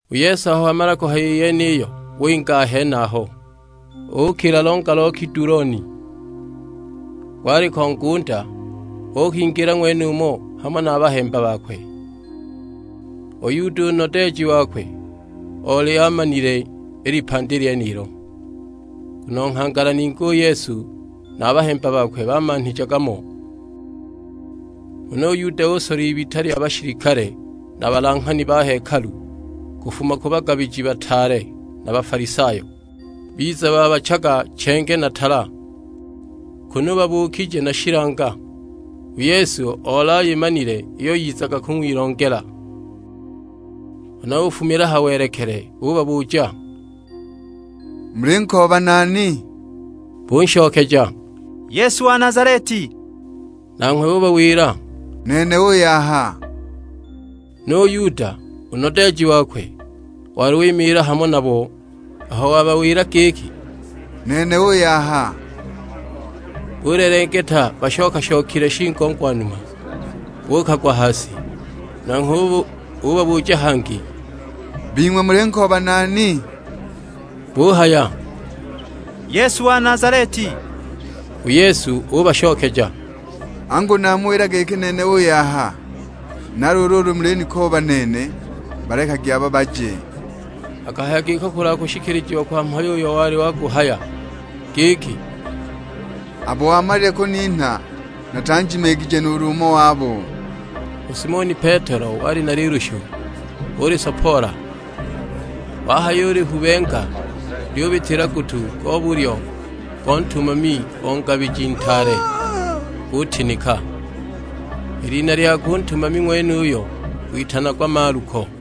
U Yesu aho wamala kuhaya i yeniyo winga a henaho, ukila longa lo Kiduloni; gwaliko ngunda, uukingila ng'wenumo hamo na a bahemba bakwe. U Yuda, u nodeeji wakwe, oli alimanile i lipandi lyenilo; nguno nghangala ningi u Yesu na a bahemba bakwe bamanhijaga mo. Huna u Yuda usola ibita lya bashilikale na balanghani ba hekalu, kufuma ku bagabiji bataale na Bafalisayo. Biza babachaga chenge na tala, kunu babuukije na shilanga. U Yesu oli ayimanile iyo yizaga kung'wilongela; huna ufumila ha welekele ubabuja, "Mulinkooba nani?" Bunshokeja, "Yesu wa Nazaleti." Nanghwe ubawila, "Nene uuy'aha." Nu Yuda, u nodeeji wakwe, wali wimiila hamo nabo. Aho wabawila giki, "Nene uuy'aha," bulelengeta bashoka-shokile shigongwanuma, buukagwa ha si! Nanghwe ubabuja hangi, "Bing'we mulinkooba nani?" Buhaya, "Yesu wa Nazaleti." U Yesu ubashokeja, "Angu namuwila giki nene uuy'aha! Na luulu ulu mulinikooba nene, balekagi aba baje." Akahaya giko kulwa kushikilijiwa kwa mhayo uyo wali waguhaya; giki, "Abo wamalile kuninha natanjimiigije nuulu umo wabo." U Simoni Petelo wali na lilushu, ulisopoola; wahayulihubenga lyubitila gutu go bulyo go ntumami o ngabiji ntaale, gutinika! I lina lyakwe u ntumami ng'wenuyo witanagwa Maluko.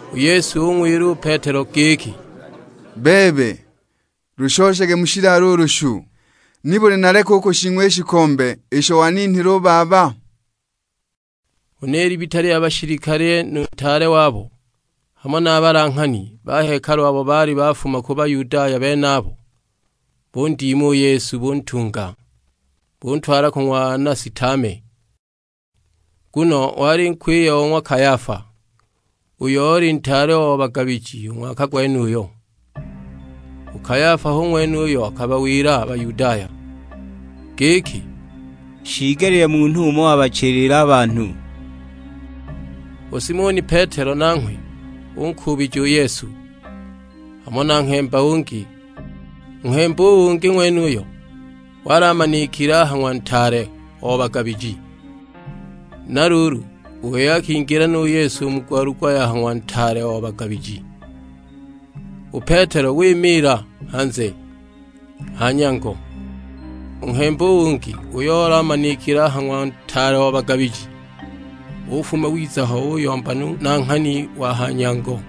U Yesu ung'wila u Petelo giki, "Bebe lushoshage mu shilalo u lushu; nibuli naleke u kushing'wa i shikombe isho waninhile u Baba?" Huna i libita lya bashilikale nu ntaale wabo, hamo na a balanghani ba hekalu abo baali bafuma ku Bayudaya benabo, bundima u Yesu buntunga. Buntwala ku ng'wa Anasi tame; nguno wali nkwiye o ng'wa Kayafa, uyo oli ntaale o bagabiji u ng'waka gwenuyo. U Kayafa hu ng'wene uyo akabawila a Bayudaya giki, "Shiigelile munhu umo abachilile a banhu." U Simoni Petelo nanghwe unkuubija u Yesu, hamo na nghemba ungi; u nghemba u ungi ng'wenuyo wali amanikile a ha ng'wa ntaale o bagabiji, na luulu u wei akingila nu Yesu u mu gwalugwa ya ha ng'wa ntaale o bagabiji. U Petelo wimiila hanze, ha nyango. U nghemba u ungi, uyo oli amanikile a ha ng'wa ntaale o bagabiji, ufuma wiza ho uyomba nu nanghani wa ha nyango,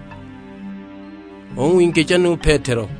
ung'wingija nu Petelo.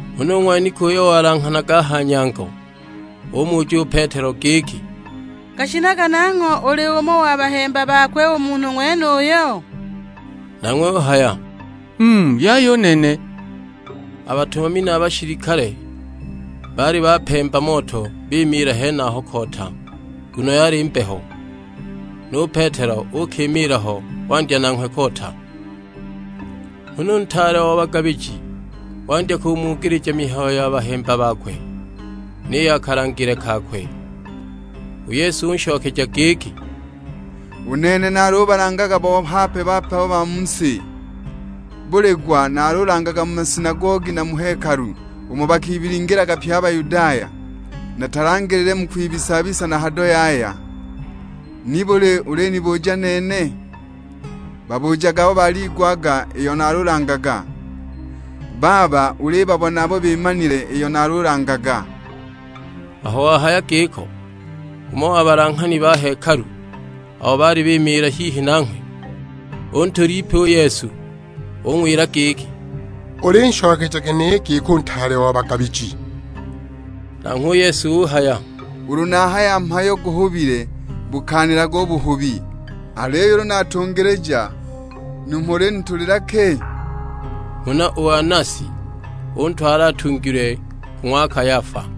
Huna u ng'waniki uyo walanghanaga a ha nyango umuja u Petelo giki, "Gashinaga nangho uli umo wa bahemba bakwe u munhu ng'wenuyo?" Nanghwe uhaya, "Mm yaya u nene!" A batumami na a bashilikale baali bapemba moto bimiila henaho koota nguno yali mbeho, nu Petelo uukimiila ho wandya nanghwe koota. Huna u ntaale o bagabiji wandya kumugilija mihayo ya bahemba bakwe, ni ya kalangile kakwe. U Yesu unshokeja giki, "U nene nalubalangaga bo hape-hape a ba mu si; buli gwa naalulangaga mu masinagogi na mu hekalu, umo bakibilingilaga pye a Bayudaya, natalangile mu kwibisa-bisa na hado yaya. Nibuli ulinibuja nene? Babujage abo baliigwaga iyo nalulangaga; baaba ulibabona abo bimanile iyo nalulangaga." Aho wahaya giko, umo wa balanghani ba hekalu abo baali bimiila hihi nanghwe, untula ipi u Yesu. Ung'wila giki, "Ulinshokeja ginehe i giko u ntaale o bagabiji?" Nanghwe u Yesu uhaya, "Ulu nahaya mhayo guhubile bukaanilage u buhubi, aliyo ulu natungilija, numho ulinitulila ki?" Huna u Anasi untwala atungilwe, ku ng'wa Kayafa.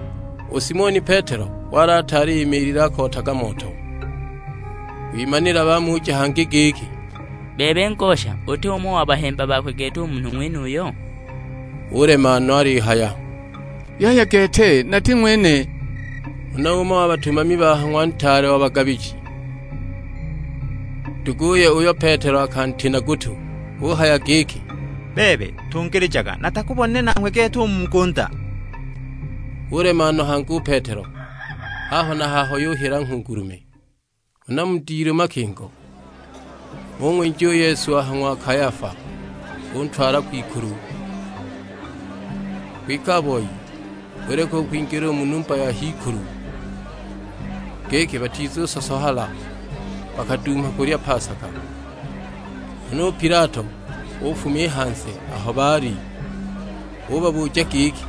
U Simoni Petelo wali ataali imiilile akootaga moto; kwimanila bamuja hangi giki, "Bebe ngosha, uti umo wa bahemba bakwe gete u munhu ng'wenuyo?" Ulema no; alihaya, "Yaya gete nati ng'wene!" Huna umo wa batumami ba ha ng'wa ntaale o bagabiji, nduguye uyo Petelo akantina gutu; uhaya giki, "Bebe, tungilijaga; natakubonile nanghwe gete u mu ngunda?" Ulema no hangi u Petelo; haho na haho yuhila nghungulume! Huna mu dilu makingo, bung'winja u Yesu a ha ng'wa Kayafa, buntwala kwikulu. Kwike a boi buleka u kwingila u mu numba ya h'ikulu, giki batizusosohala, bakaduuma kulya pasaka. Huna u Pilato ufuma i hanze aho baali; ubabuja giki,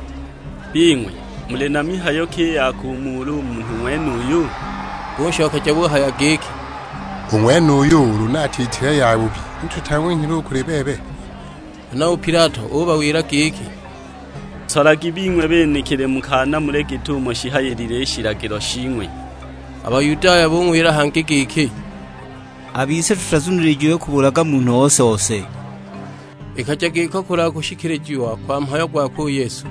"Bing'we muli na mihayo ki i ya kumuula u munhu ng'wenuyu?" Bunshokeja buhaya giki, "U ng'wenuyu ulu ni atiitile yabubi ni tutang'wenhile u kuli bebe." Huna u Pilato ubawila giki, "Nsolagi bing'we benekili mukaanamule git'umo shihayilile i shilagilo shing'we." A Bayudaya bung'wila hangi giki, "A bise tutazunilijiwe kubulaga munhu ose-ose!" Ikaja giko kulwa kushikilijiwa kwa mhayo gwakwe u Yesu,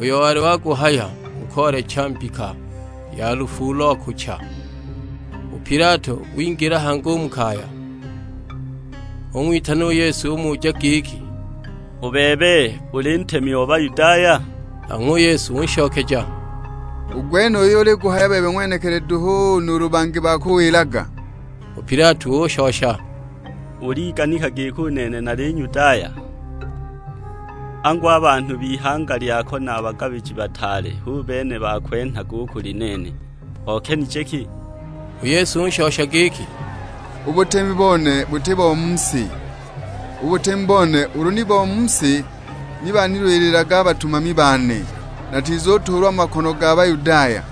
uyo wali waguhaya mu koolecha mbika ya lufu ulo akucha. U Pilato wingila hangi u mu kaya, ung'witana u Yesu umuja giki, "U bebe, uli ntemi o Bayudaya?" Nanghwe u Yesu unshokeja, "U gwenuyo uliguhaya bebe ng'wenekili duhu, nuulu bangi bakuwilaga?" U Pilato ushosha, "Uliganika giki u nene nali Nyudaya? Angu a banhu b'ihanga lyako na a bagabiji bataale hu bene bakwenhaga u kuli nene; okenije ki?" U Yesu ushosha giki, "U butemi bone buti bo mu si; u butemi bone ulu ni bo mu si, ni banilwililaga a batumami bane, natizutuulwa mu makono ga Bayudaya,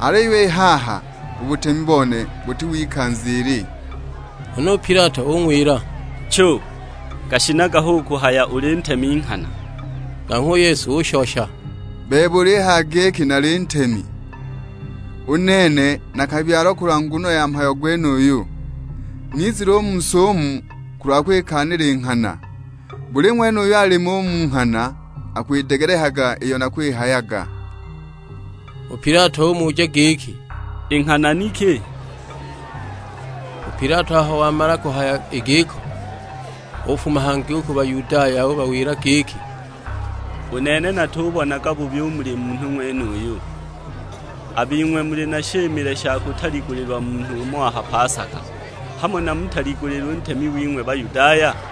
aliyo i haha u butemi bone buti w'ikanza ili." Huna u Pilato ung'wila; "Chu, gashinaga hu kuhaya uli ntemi nghana!" Nanghwe u Yesu ushosha, "Bebe ulihaya giki nali Ntemi. U nene nakabyalwa kulwa nguno ya mhayo gwenuyu, nizile u mu si umu kulwa kwikaanila i nghana; buli ng'wene uyo alimo u mu nghana akwidegelekaga iyo nakwihayaga." U Pilato umuja giki, "I nghana ni ki?" U Pilato aho wamala kuhaya i giko ufuma hangi u ku Bayudaya. Ubawila giki, "U nene natubonaga bubi u muli munhu ng'wenuyu. A bing'we muli na shimile sha kutaligulilwa munhu umo a ha pasaka, hamo namutaligulile u ntemi wing'we Bayudaya?"